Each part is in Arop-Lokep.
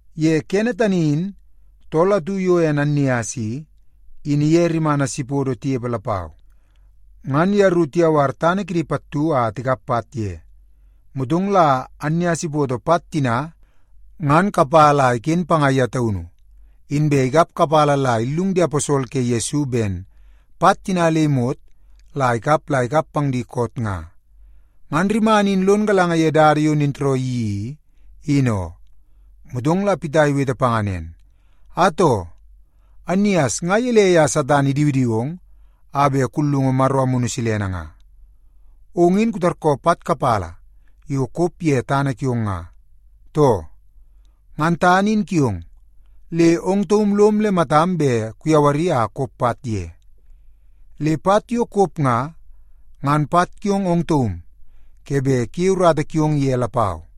Ye kene tani in, tool atu yo ene Annias i, in iye rimana Sipodo tinepe lapau. Ngan yeru tiyawar tana kidi pattu a tikap pat ye. Motong la Annias ipoto pat tina ngan kapala a iken panga ye taunu, inbe ikap kapala la illung di aposol ke Yesu ben pat tina le imot yo ikap nga, ngan la ikap la ikap pang di koot nga. Ngan rimana in lon galanga ye dada yo nintooroo iyeii i, in oo. Motong la Pita iwete panga nen, “Atoo, Annias nga gelei a Satan idiwidiwong a bet kullungu Maro Amunu Silene nga? Ong in kutarkoo pat kapala yo kop ye tana kiong nga, too? Ngan tana in kiong, le ong taum lom le matam bet kuyawari a kop pat ye. Le pat yo kop nga, ngan pat kiong ong taum ke bet kuyei urata kiong ye lapau.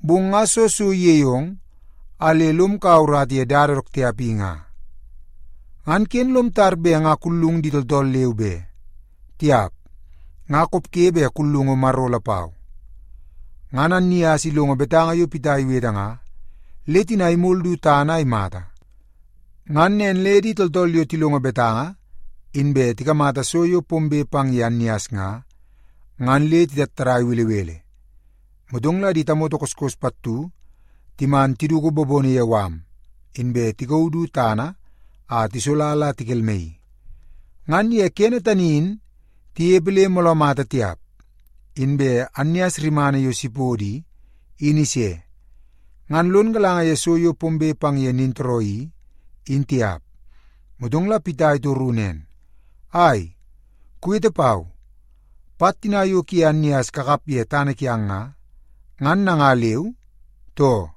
Bong nga soo so iyeie ong a le lom kaua urata ye dada dook tiap i nga? Ngan ken lom tar bet nga kullung di tooltool leu be. Tiap, nga kopge bet kullungu Maro lapau.” Ngan Annias ilongo betanga yo Pita iwete nga, le tina imol du tana a imata. Ngan nen le di tooltool yo tilongo betanga, inbe tikamata so yo pombe pang ye Annias nga, ngan le titattadai belebele. Motong la di tamoto koskos pattu timan tiduku bobono ye mala, inbe tikauu du tana a tisola la tikelmaii. Ngan ye kene tani in tinepe le mooloo mata tiap, inbe Annias rimana yo Sipodo i, in ise. Ngan lon galanga ye so yo pombe pang ye nintooroo i, in tiap. Motong la Pita itoru nen, “Ai, kuwete pau. Pat tina yo kuye Annias kakap ye tana kiang nga, ngan nanga leu, too?”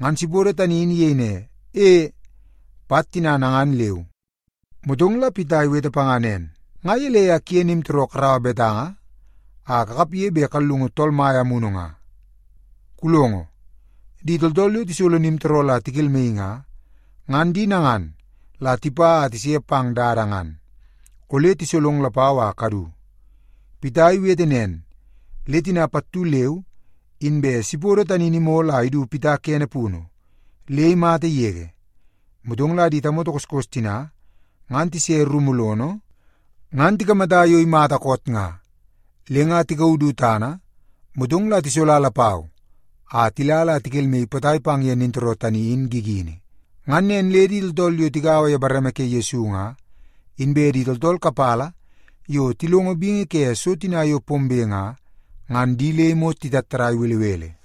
Ngan Sipodo tani in iyei ne, “E, pat tina nangan leu.” Motong la Pita iwete panga nen, “Nga gelei a kuye nimtooroo karaua betanga a kakapge bet kallungu Tool Mai Amunu nga? Kulongo, di tooltool yo tisolo nimtooroo la tikelmaii nga, ngan di nangan la tipa a tise pang dada ngan. Ole tisolong lapau a kadu.” Pita iwete nen, le tina pattu leu inbe Sipodo tani in imol a idu Pita kene punu, le imata yege. Motong la di tamoto koskos tina ngan tise rumu lono, ngan tikamata yo imata koot nga. Le nga tikauu du tana, motong la tisola lapau a tila la tikelmaii potai pang ye nintooroo tani in gigini. Ngan nen le di tooltool yo tigaua ye bareme ke Yesu nga, inbe di tooltool kapala yo tilongo bingi ke so tina yo pombe nga, ngan di le imot titattadai belebele.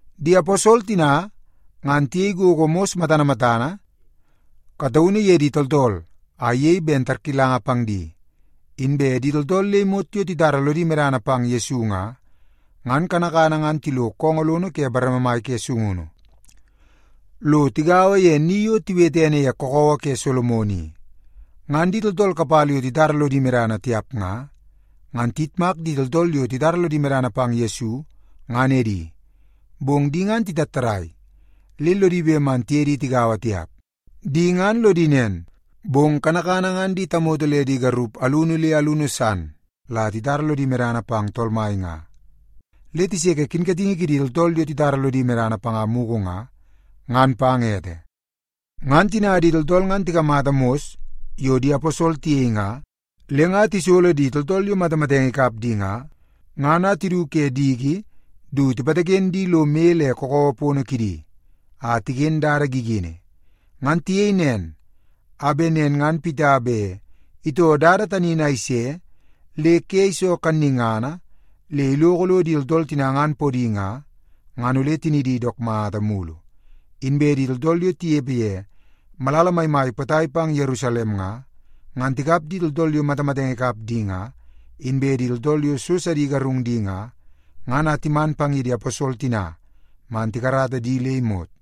Di aposol tina, ngan tiyei gogo mos matana matana kataunu ye di tooltool, a iyei ben tarkilanga pang di. Inbe di tooltool le imot yo titara lodi medana pang Yesu nga, ngan kanakana ngan tilo koongoo lono ke bareme mai ke sungunu, lo tigaua ye ni yo tiwete ene ye Kakawa ke Solomon i. Ngan di tooltool kapala yo titara lodi medana tiap nga, ngan tiyitmak di tooltool yo titara lodi medana pang Yesu, ngan edi. Bong di ngan titattadai, le lodi bet man tiye di tigaua tiap. Di ngan lodi nen, bong kanakana ngan di tamoto le di garup alunu le alunu san la titara lodi medana pang Tool Mai nga, le tiseke kinkatingi kidi tooltool yo titara lodi medana panga mugu nga, ngan pang ete. Ngan tina di tooltool ngan tikamata mos yo di aposol tiyei nga, le nga tisolo di tooltool yo matamatenge ikap di nga, ngan a tidu ke diki du tipataken di lo moi le kakawa pono kidi, a tiken dada gigini. Ngan tiyei nen a bet nen ngan Pita bet itoo dada tani in a ise le ke iso kannungana le iloko lo di tooltool tina ngan podi nga, ngan ole tinidi dook mata mulu. Inbe di tooltool yo tinepe ye malala maimai potai pang ye Yerusalem nga, ngan tikap di tooltool yo matamatenge ikap di nga, inbe di tooltool yo so sidi igarung di nga, ngan a timan pang ye di aposol tina man tikarata di le imot.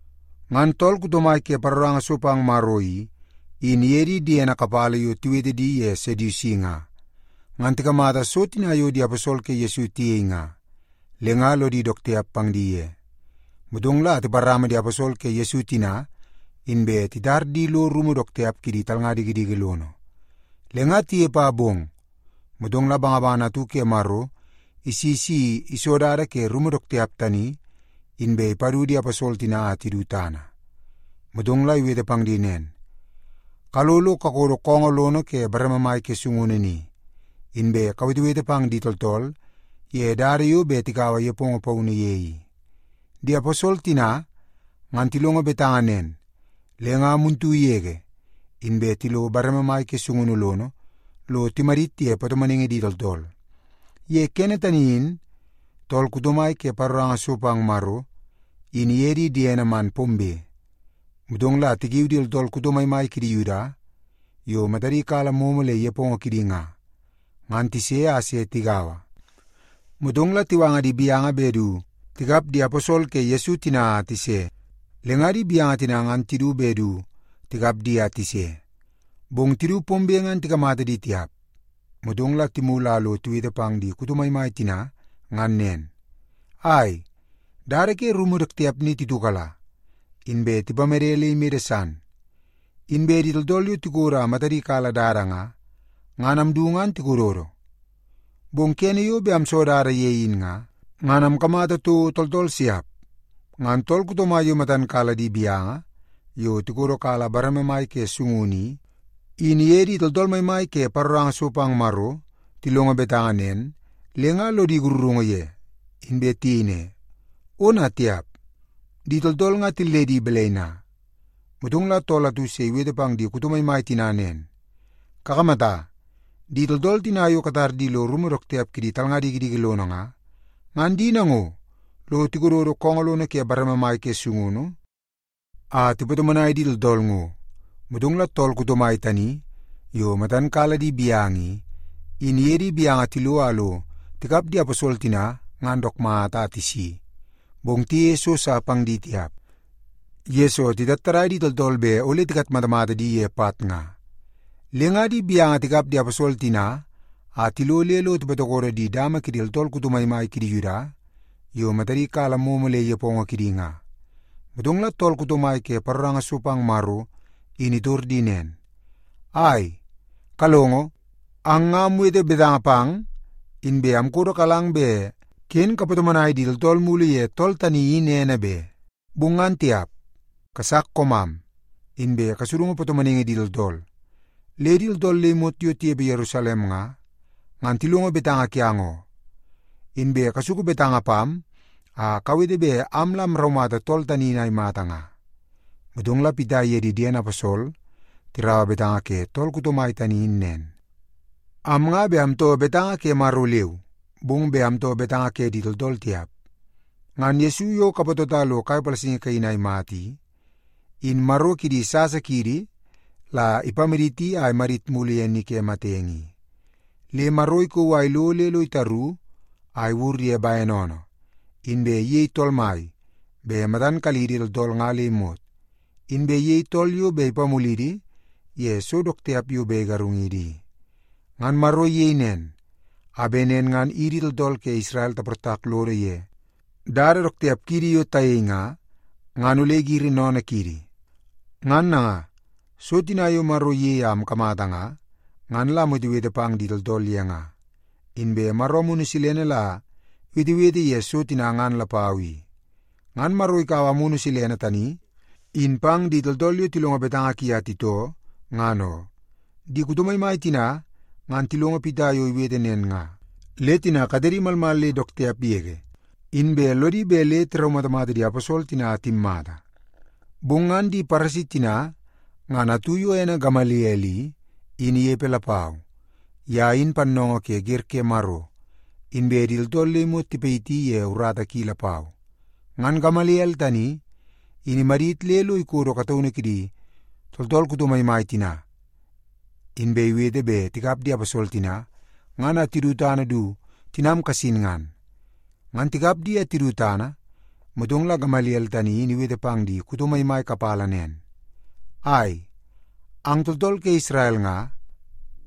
Ngan tool kuto mai ke paroranga so pang Maro i, in iye di diene kapala yo tiwete di ye Sedusi nga, ngan tikamata so tina yo di aposol ke Yesu tiyei nga, le nga lodi dook tiap pang di ye. Motong la tiparama di aposol ke Yesu tina, inbe titar di lo rumu dook tiap kidi talnga dikidiki lono. Le nga tinepe a bong, motong la bangabangana atu ke Maro isi si iso dada ke rumu dook tiap tani, inbe ipadu di aposol tina a tidu tana. Motong la iwete pang di nen, “Kalo lo kakodo koongoo lono ke bareme mai ke sungunu ni, inbe kawetewete pang di tooltool ye dada yo bet tikaua nepongo paunu ye i.” Di aposol tina, ngan tilongo betanga nen, le nga muntu yege inbe tilo bareme mai ke sungunu lono lo timadit ye patomonaingi di tooltool. Ye kene tani in tool kuto mai ke paroranga so pang Maro, in iye di diene man pombe, motong la tikiu di tooltool kuto maimai kidi Yuda yo matadi kala momo le nepongo kidi nga, ngan tise a se tigaua. Motong la tiwanga di gaunu bet du tikap di aposol ke Yesu tina a tise. Le nga di gaunu tina ngan tidu bet du tikap di a tise, bong tidu pombe ngan tikamata di tiap. Motong la timulu a lo tiwete pang di kuto maimai tina ngan nen, “Ai, dada ke rumu dook tiap ni titiukala, inbe tipamede le imede san. Inbe di tooltool yo tikodo a matadi kala dada nga, ngan amdu ngan tikododo. Bong kene yo bet amso dada ye in nga, ngan amkamata toko tooltool siap.” Ngan tool kuto mai yo matan kala di gaunu yo tikodo kala bareme mai ke sungunu i, in iye di tooltool maimai ke paroranga so pang Maro tilongo betanga nen, le nga lodi sakarungu ye, inbe tiyei ne, “Ona tiap! Di tooltool nga tilledi balai na?” Motong la tool atu se iwete pang di kuto maimai tina nen, “Kakamata! Di tooltool tina yo katar di lo rumu dook tiap kidi talnga dikidiki lono nga, ngan di nango lo tikododo koongoo lono ke bareme mai ke sungunu a tipatomonai di tooltool ngo.” Motong la tool kuto mai tani yo matan kala di gaunu i, in iye di gaunu tilo a lo tikap di aposol tina ngan dook mata a tisi. Bong tiyeie so sa pang di tiap, yesoo titattadai di tooltool bet ole tikatmatamata di ye pat nga. Le nga di gaunu tikap di aposol tina a tilo le lo tipatokodo di dama kidi tooltool kuto maimai kidi Yuda yo matadi kala momo le nepongo kidi nga. Motong la tool kuto mai ke paroranga so pang Maro in itor di nen, “Ai! Kalongo, ang nga amwete betanga pang, inbe amkodokalang bet ken kapatomonai di tooltool mulu ye tool tani in ene be. Bong ngan tiap, kasak koomam, inbe kasudungu patomonaingi di tooltool. Le di tooltool le imot yo tinepe Yerusalem nga, ngan tilongo betanga kiang oo. Inbe kasuku betanga pam a kawete bet am la amraumata tool tani in a imata nga.” Motong la Pita iye di diene aposol tiraua betanga ke tool kuto mai tani in nen, “Am nga bet amtoo betanga ke Maro leu, bong bet amtoo betanga ke di tooltool tiap. Ngan Yesu yo kapatota lo kai palasingi kaini a imata i, in Maro kidi sasa kiidi la ipamaditi a imadit mulu ye ni ke matenge i. Le Maro ikauu a ilo le lo itaru a iwur ye bene oonoo, inbe iyei tool mai bet matan kalidi tooltool nga le imot, inbe iyei tool yo bet ipamulidi ye so dook tiap yo bet igarungidi i. Ngan Maro iyei nen, a bet nen ngan idi tooltool ke Isrel taportak lodo ye dada dook tiap kiidi yo tayei nga, ngan ole igiri sennene kiidi. Ngan nanga, so tina yo Maro iyei a amkamata nga, ngan la amwetewete pang di tooltool ye nga. Inbe Maro Amunu Silene la iwetewete ye so tina ngan lapau i. Ngan Maro ikaua Amunu Silene tani in pang di tooltool yo tilongo betanga ki a titoo, ngan oo.” Di kuto maimai tina ngan tilongo Pita yo iwete nen nga, le tina katedi malmal le dook tiap yege, inbe lodi bet le tiraumatamata di aposol tina a timmata. Bong ngan di Paresi tina ngan atu yo ene Gamaliel i, in inepe lapau. Ye in pannoongoo ke wer ke Maro, inbe di tooltool le imot tipayiti ye urata ki lapau. Ngan Gamaliel tani, in imadit le lo ikodo kataunu kidi tooltool kuto maimai tina, inbe iwete bet tikap di aposol tina ngan a tidu tana du tinam kasin ngan. Ngan tikap di a tidu tana, motong la Gamaliel tani in iwete pang di kuto maimai kapala nen, “Ai, ang tooltool ke Isrel nga,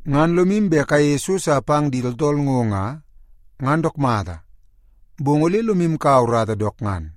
ngan lomu bet kayeie so sa pang di tooltool ngo nga, ngan dook mata, bong ole lomu kaua urata dook ngan.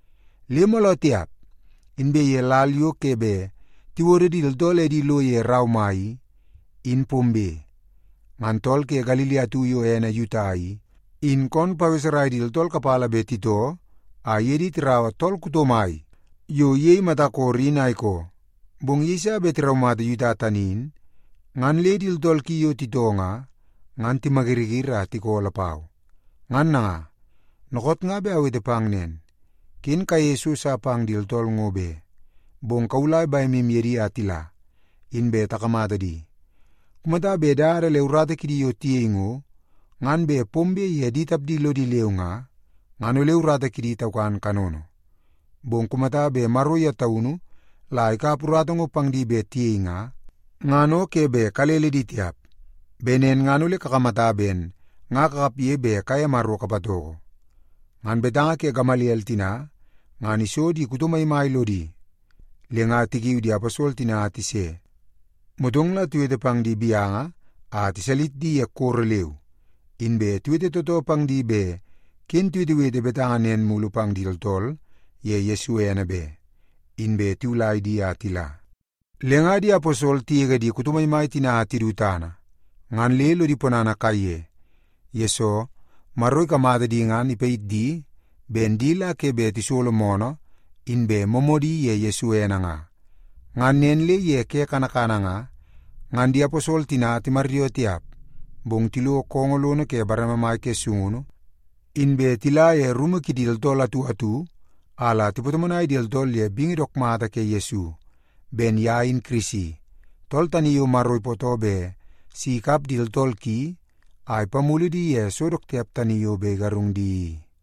Le mooloo tiap, inbe ye lal yo ke bet tiwodo di tooltool edi lo ye rau mai i, in pombe, ngan tool ke Galili atu yo ene Yuta i, in koon paweserai di tooltool kapala bet titoo a iye di tiraua tool kuto mai yo iyei mata koro in a ikoo. Bong yeiso bet tiraumata Yuta tani in, ngan le di tooltool ki yo titoo nga, ngan timayiriyiri a tikoo lapau. Ngan nanga, dookoot nga bet awete pang nen, ken kayeie so sa pang di tooltool ngo be. Bong kawulai bemu ye di a tila, inbe takamata di. Kumata bet dada le urata kidi yo tiyei ngo, ngan bet pombe ye di tapdi lodi leu nga, ngan ole urata kidi taukan kanono. Bong kumata bet Maro ye taunu la ikap urata ngo pang bet tiyei nga, ngan o ke bet kalele di tiap. Bet nen ngan ole kakamata ben nga kakapge bet kaye Maro kapatoko.” Ngan betanga ke Gamaliel tina ngan iso di kuto maimai lodi, le nga tikiu di aposol tina a tise. Motong la tiwete pang di gaunu a tiwalis di ye koro leu. Inbe tiwete tootoo pang di bet ken tiwetewete betanga nen mulu pang di tooltool ye Yesu ene be, inbe tiwulai di a tila. Le nga di aposol tigege di kuto maimai tina a tidu tana, ngan le lodi ponana kaiye, yesoo Maro ikamata di ngan ipayit di ben di la ke bet tisolo moonoo nen ye Yesu ene nga. Ngan nen le ye ke kanakana nga, ngan di aposol tina timaryoo tiap, bong tilo koongoo lono ke bareme mai ke sungunu, inbe tila ye rumu kidi tooltool atu atu a la tipatomonai di tooltool ye bingi dook mata ke Yesu, ben ye in Kirisi, tool tani yo Maro ipootoo bet si ikap di tooltool ki a ipamulu di ye so dook tiap tani yo bet igarung di i.